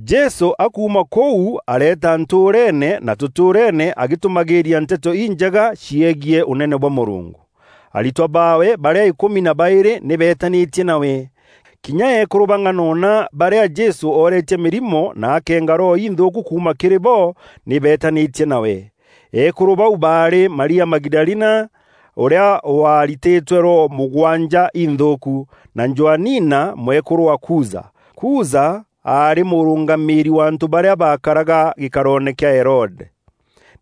Jesû akuuma kûu areeta ntûûreene na tûtûûreene, agîtûmagîîria Nteto Injega ciegiî Ûnene bwa Mûrungu. Aritwa baawe, barîa îkûmi na baîrî nî beetanîtie nawe. Kinya eekûrû bang'anona barîa Jesû ooretie mîrimo na akeenga roho inthûûku kuuma kîrî bo, nî beetanîtie nawe. Eekûrû bau baarî Maria Magidalina, ûrîa waaritîtwe roho mûgwanja inthûûku; na Joanina mwekûrû wa Kuza. Kuza aarî mûrûngamîîri wa antû barîa baakaraga gîkaroone kîa Herode.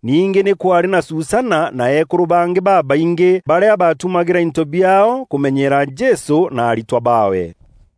Ningî nî kwaarî na Susana na eekûrû bangî babaingî barîa baatumagîra into biaao kûmenyeera Jesû na aritwa baawe.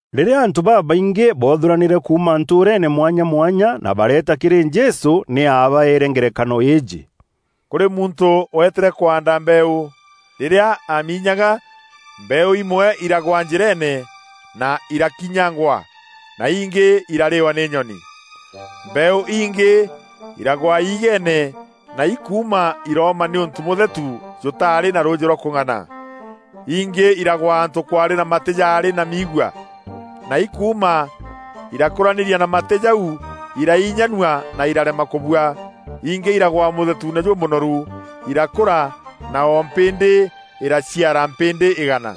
Rîrîa antû babaingî boothûranîre kuuma ntûûreene mwanya mwanya na bareeta kîrî Jesû, nî aabaeere ngerekano îîjî: “Kûrî muntû weetîre kwaanda mbeeû. Rîrîa aaminyaga, mbeeû imwe iragwa njîreene na irakinyangwa na ingî irarîwa nî nyoni. Mbeeû ingî iragwa iigeene na ikuuma irooma nîûntû mûthetu jûtaarî na rûûjî rwa kûng'ana. Ingî iragwa antû kwaarî na matî jarî na miigua, na ikuuma, irakûranîria na matî jau iraiinyanua na irarema kûbua. Ingî iragwa mûthetuune jûmûnoru, irakûra, na o mpîndî îraciara mpîndî îgana.”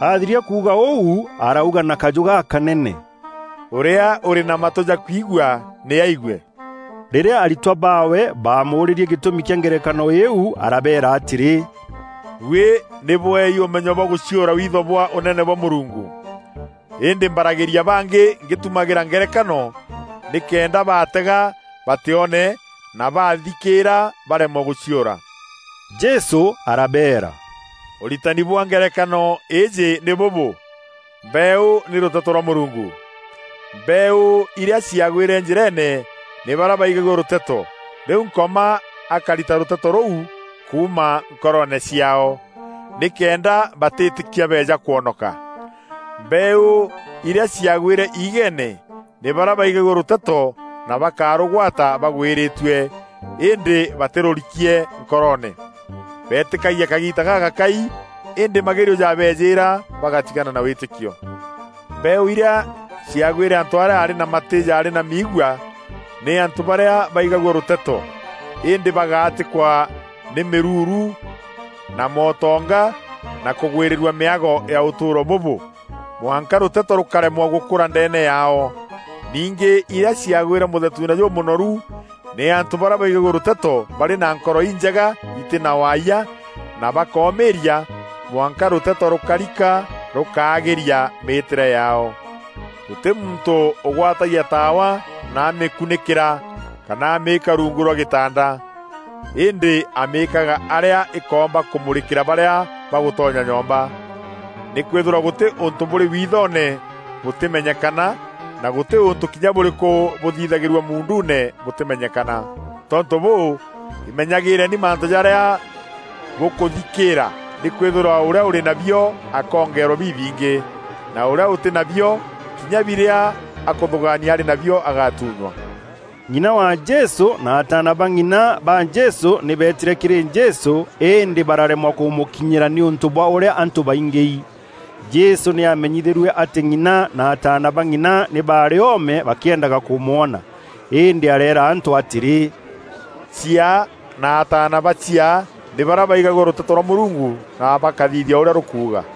Athiria kuuga ûu, arauga na kajû gakanene, “Ûrîa ûrî na matû ja kwigua, nî aigue.” Rîrîa aritwa baawe baamûûrîrie gîtûmi kîa ngerekano îîu, arabeera atîrî, “Buî nî bweei ûmenyo bwa gûciûra witho bwa Ûnene bwa Mûrungu, îndî mbaragîria bangî ngîtumagîra ngerekano nîkenda baatega batîone na baathikîîra bareemwe gûciûra.” Jesû arabeera, “Ûritani bwa ngerekano îîjî nî bûbû: mbeeû nî rûteto rwa Mûrungu. Mbeeû irîa ciagwîre njîreene nî barîa baigagua rûteto, rîu Nkoma akarita rûteto rûu kuuma nkoroone ciaao, nîkenda batîîtîkia beeja kwonoka. Mbeeû irîa ciagwîre iigeene nî barîa baigagua rûteto na bakarûgwata bagwîrîtue, îndî batîrûrikie nkoroone. Beetîkagia kagiita gagakai îndî magerio jabeejîîra, bagatigana na wîtîkio. Mbeeû irîa ciagwîre antû arîa aarî na matî jarî na miigua, nî antû barîa baigagua rûteto, îndî bagaatîkwa nî mîruuru na mootonga na kûgwîrîrua mîago ya ûtûûro bûbû, mwanka rûteto rûkaremwa gûkûra ndeene yaao. Ningî irîa ciagwîre mûthetuune jûmûnoru, nî antû barîa baigagua rûteto barî na nkoro injega itî na waayia, na bakoomîîria mwanka rûteto rûkarika rûkaagîria mîîtîre yaao.” “Gûtî muntû ûgwatagia taawa na amîkunîkîra kana amîîka rungu rwa gîtanda. Îndî amîîkaga arîa îkoomba kûmûrîkîra barîa bagûtonya nyomba. Nîkwîthîrwa gûtî ûntû bûrî withoone bûtîmenyekana na gûtî ûntû kinya bûrîkû bûthithagîrua muunduune bûtîmenyekana. Tontû bûû, îmenyagîîreni mantû jarîa bûkûthikîîra nîkwîthîrwa ûrîa ûrî nabio akoongerwa bibingî, na ûrîa ûtî nabio, kinya birîa akûthûgaania arî nabio agatunywa.” Ng'ina wa Jesû na ataana ba ng'ina ba Jesû nî beetîre kîrî Jesû, îndî bararemwa kûmûkinyîra nîûntû bwa ûrîa antû baingîi. Jesû nî aamenyithîrue atî ng'ina na ataana ba ng'ina nî baarî oome bakîendaga kûmwona. Îndî areera antû atîrî, “Chiaa na ataana ba chiaa nî barîa baigagua rûteto rwa Mûrungu na bakathithia ûrîa rûkuuga.”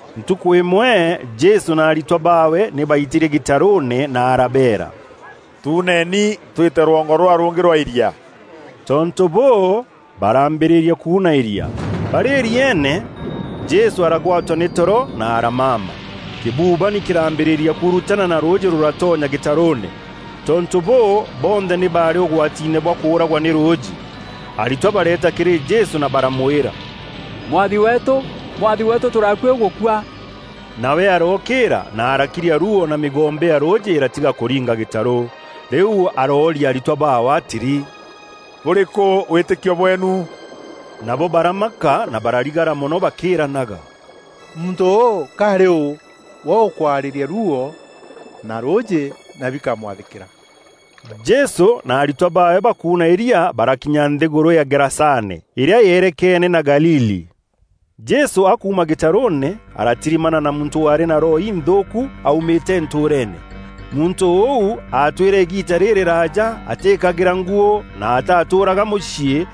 Ntukû îmwe Jesû na aritwa baawe nî baitîrie gîtarûûne na arabeera, “Tuuneni twîte rwongo rûrîa rûngî rwa îria.” Tontû bûû, baraambîrîria kuuna îria. Barî îrieene, Jesû aragwatwa nî toro na aramama. Kîbûbanî kîraambîrîria kuurutana na rûûjî rûratonya gîtarûûne. Tontû bûû, bonthe nî baarî ûgwatiine bwa kûûragwa nî rûûjî. Aritwa bareeta kîrî Jesû na baramwîra, “Mwathi weetû, Mwathi weetû tûrî akuî gûkua!” Nawe arookîîra na arakiria ruuo na mîgombe ya rûûjî îratiga kûringa gîtarû. Rîu aroorîa aritwa baawe atîrî, “Bûrîkû wîtîkio bweenu?” Nabo baramaka na bararigara mono bakîîranaga, “Muntû ûû ka arî ûû we ûkwarîria ruuo na rûûjî na bikamwathîkîra?” Jesû na aritwa baawe bakuuna îria, barakinya nthîgûrû ya Gerasane, îrîa yeerekene na Galili. Jesû akuuma gîtarûûne, aratirimana na muntû waarî na roho inthûûku aumîte ntûûreene. Muntû ûu aatwîre îgiita rîrîraaja atîîkagîra nguû na atatûûraga mûciî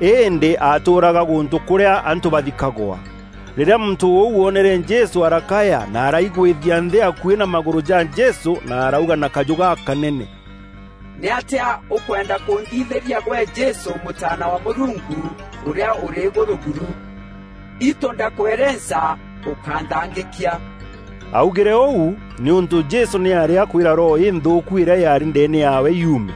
îndî aatûûraga gûntû kûrîa antû baathikagwa. Rîrîa muntû ûu oonere Jesû arakaya na araigwîthia nthî akuî na magûrû ja Jesû na arauga na kajû gakanene, “Nîatîa ûkwenda kûnthithîria gwe Jesû Mûtaana wa Mûrungu Ûrîa Ûrî Îgûrû buru? Itû ndakwerenca ûkanthangîkia!” Augîre ûu nîûntû Jesû nî aarî akwîra roho înthûûku îrîa yaarî ndeene yaawe yuume.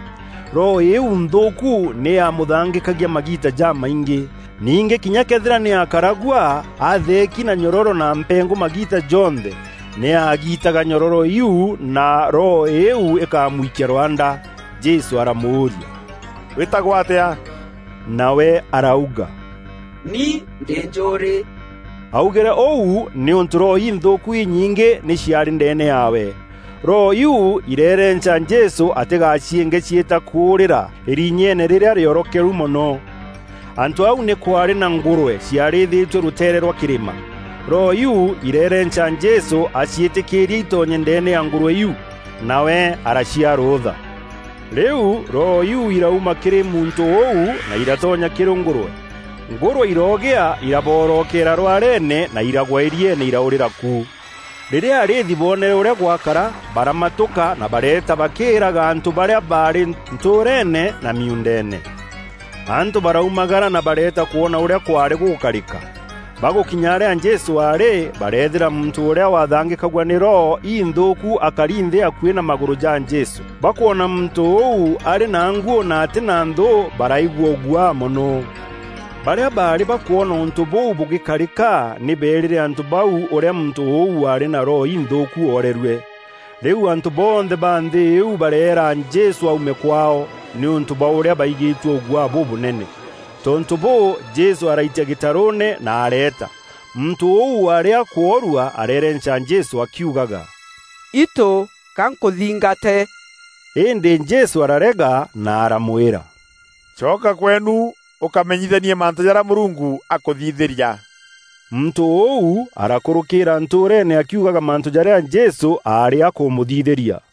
Roho îîu nthûûku nî yaamûthangîkagia magiita jamaingî. Ningî kinya këethîra nî aakaragua atheeki na nyororo na mpengû magiita jonthe, nî aagitaga nyororo iu na roho îîu îkamwikia rwanda. Jesû aramûûria, “Wîtagwa atîa?” Nawe arauga, “Ni ndî njûûrî.” Augîre ûu nîûntû roho inthûûku inyingî nî ciaarî ndeene yaawe. Roho iu ireerenca Jesû atîgaciînge ciîta kûûrîra îrinyeene rîrîa rîorokeru mono. Antû au nî kwaarî na ngûrwe ciarîthîtue rûteere rwa kîrîma. Roho iu ireerenca Jesû aciîtîkîîrie îtonye ndeene ya ngûrwe iu. Nawe araciaa rûûtha. Rîu roho iu îrauma kîrî muntû ûu, na iratonya kîrî ngûrwe. Ngûrwe iroogîa iraboorokeera rwareene na iragwa îrieene iraûrîra ku. Rîrîa arîîthi boonere ûrîa gwakara, baramatûka na bareeta bakîîraga antû barîa baarî ntûûreene na miuundeene. Antû baraumagara na bareeta kwona ûrîa kwaarî gûgûkarîka. Bagûkinya arîa Jesû aarî, bareethîra muntû ûrîa waathangîkagua nî roho inthûûku akari nthî akuî na magûrû ja Jesû. Bakwona muntû ûu arî na nguû na atî na nthû baraigua ûguaa mono. Barîa baarî bakwona ûntû bûu bûgîkarîka nî beerîre antû bau ûrîa muntû ûu waarî na roho inthûûku oorerue. Rîu antû bonthe ba nthî iu bareera Jesû aume kwaao, nîûntû bwa ûrîa baigîtue ûguaa bûbûnene. Tontû bûû, Jesû araitia gîtarûûne, na areeta. Muntû ûu waarî akwoorua areerenca Jesû akiugaga, “Itû ga nkûthingate!” Îndî Jesû ararega na aramwîra, “Coka kweenu ûkamenyithanie mantû jarîa Mûrungu akûthithîria.” Muntû ûu arakûrûkîîra ntûûreene akiugaga mantû jarîa Jesû aarî akûmûthithîria.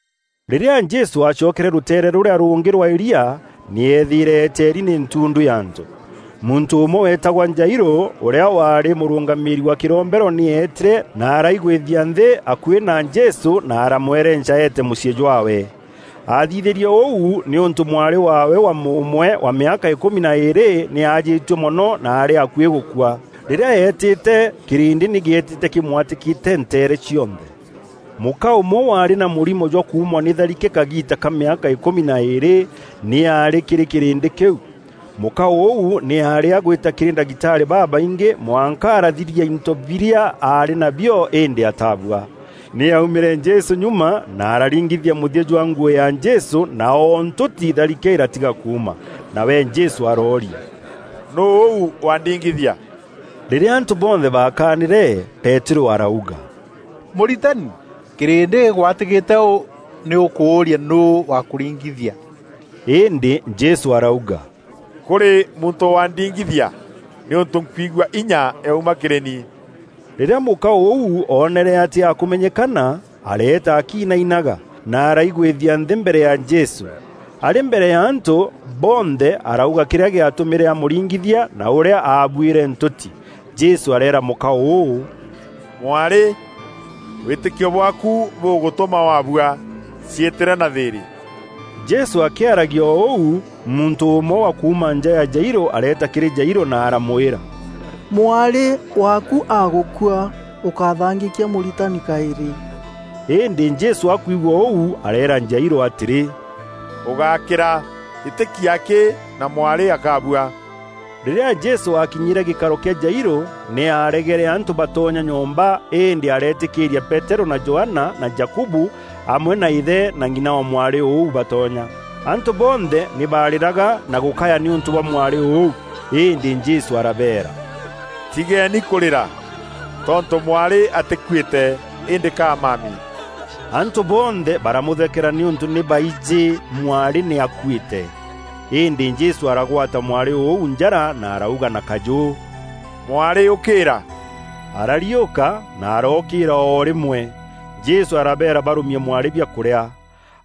Rîrîa Jesû aacokere rûteere rûrîa rûngî rwa îria, nî eethîîre eeteeri nî ntundu ya antû. Muntû ûmwe weetagwa Jairû, ûrîa waarî mûrûngamîîri wa kîrombero nî eetîre na araigwîthia nthî akuî na Jesû na aramwerenca eete mûciî jwaawe. Aathithîrie ûu nîûntû mwarî waawe wa mûûmwe, wa mîaka îkûmi na îîrî, nî aajîtue mono na aarî akuî gûkua. Rîrîa eetîte kîrîndî nî gîetîte kîmwatîkîte nteere cionthe. Mûka ûmwe waarî na mûrimo jwa kuumwa nî tharike kagiita ka mîaka îkûmi na îîrî nî aarî kîrî kîrîndî kîu. Mûka ûu nî aarî agwîta kîrî ndagitarî babaingî mwanka arathiria into birîa aarî nabio îndî atabua. Nî aumîre Jesû nyuma na araringithia mûthia jwa nguû ya Jesû na o ntûti tharike îratiga kuuma. Nawe Jesû arooria, “Nûû ûu wandingithia?” Rîrîa antû bonthe baakanîre, Peterû arauga, “Mûritani, kîrîndî gîgwatîkîte ûû nî ûkûûria nûû wa kûringithia!” Îndî Jesû arauga, “Kûrî muntû wandingithia, nîûntû nkwigua inya yauma kîrî ni.” Rîrîa mûka ûu oonere atî akûmenyekana, areeta akiinainaga, na araigwîthia nthî mbere ya Jesû. Arî mbere ya antû bonthe arauga kîrîa gîatûmîre amûringithia na ûrîa aabuîre ntûti. Jesû areera mûka ûû, “Mwarî, wîtîkio bwaaku bûgûtûma wabua. Ciîtîre na thîîrî.” Jesû akîaragia o ûu, muntû ûmwe wa kuuma nja ya Jairû areeta kîrî Jairû na aramwîra, “Mwarî waakû agûkua, ûkathangîkia Mûritani kaîrî.” Îndî Jesû akwigua ûu areera Jairû atîrî, “Ûgákîra, îtîkia akî na mwarî akabua.” Rîrîa Jesû akinyîre gîkaro kîa Jairû, nî aregere antû batonya nyomba îndî areetîkîîria Peterû na Johana na Jakubu amwe na îthe na ng'ina wa mwarî ûu batonya. Antû bonthe nî baarîraga na gûkaya nîûntû bwa mwarî ûu. Îndî Jesû arabeera, “Tigeeni kûrîra; tontû mwarî atîkuîte, îndî ka amami.” Antû bonthe baramûthekera nîûntû nî baijî mwarî nî aakuîte. Îndî Jesû aragwata mwarî ûu njara na arauga na kajû, “Mwarî ûkîîra.” Arariûka na arookîîra o rîmwe. Jesû arabeera barûmie mwarî biakûrîa.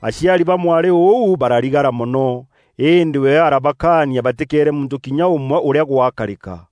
Aciari ba mwarî ûu bararigara mono, îndî we arabakaania batîkeere muntû kinya ûmwe ûrîa gwakarîka.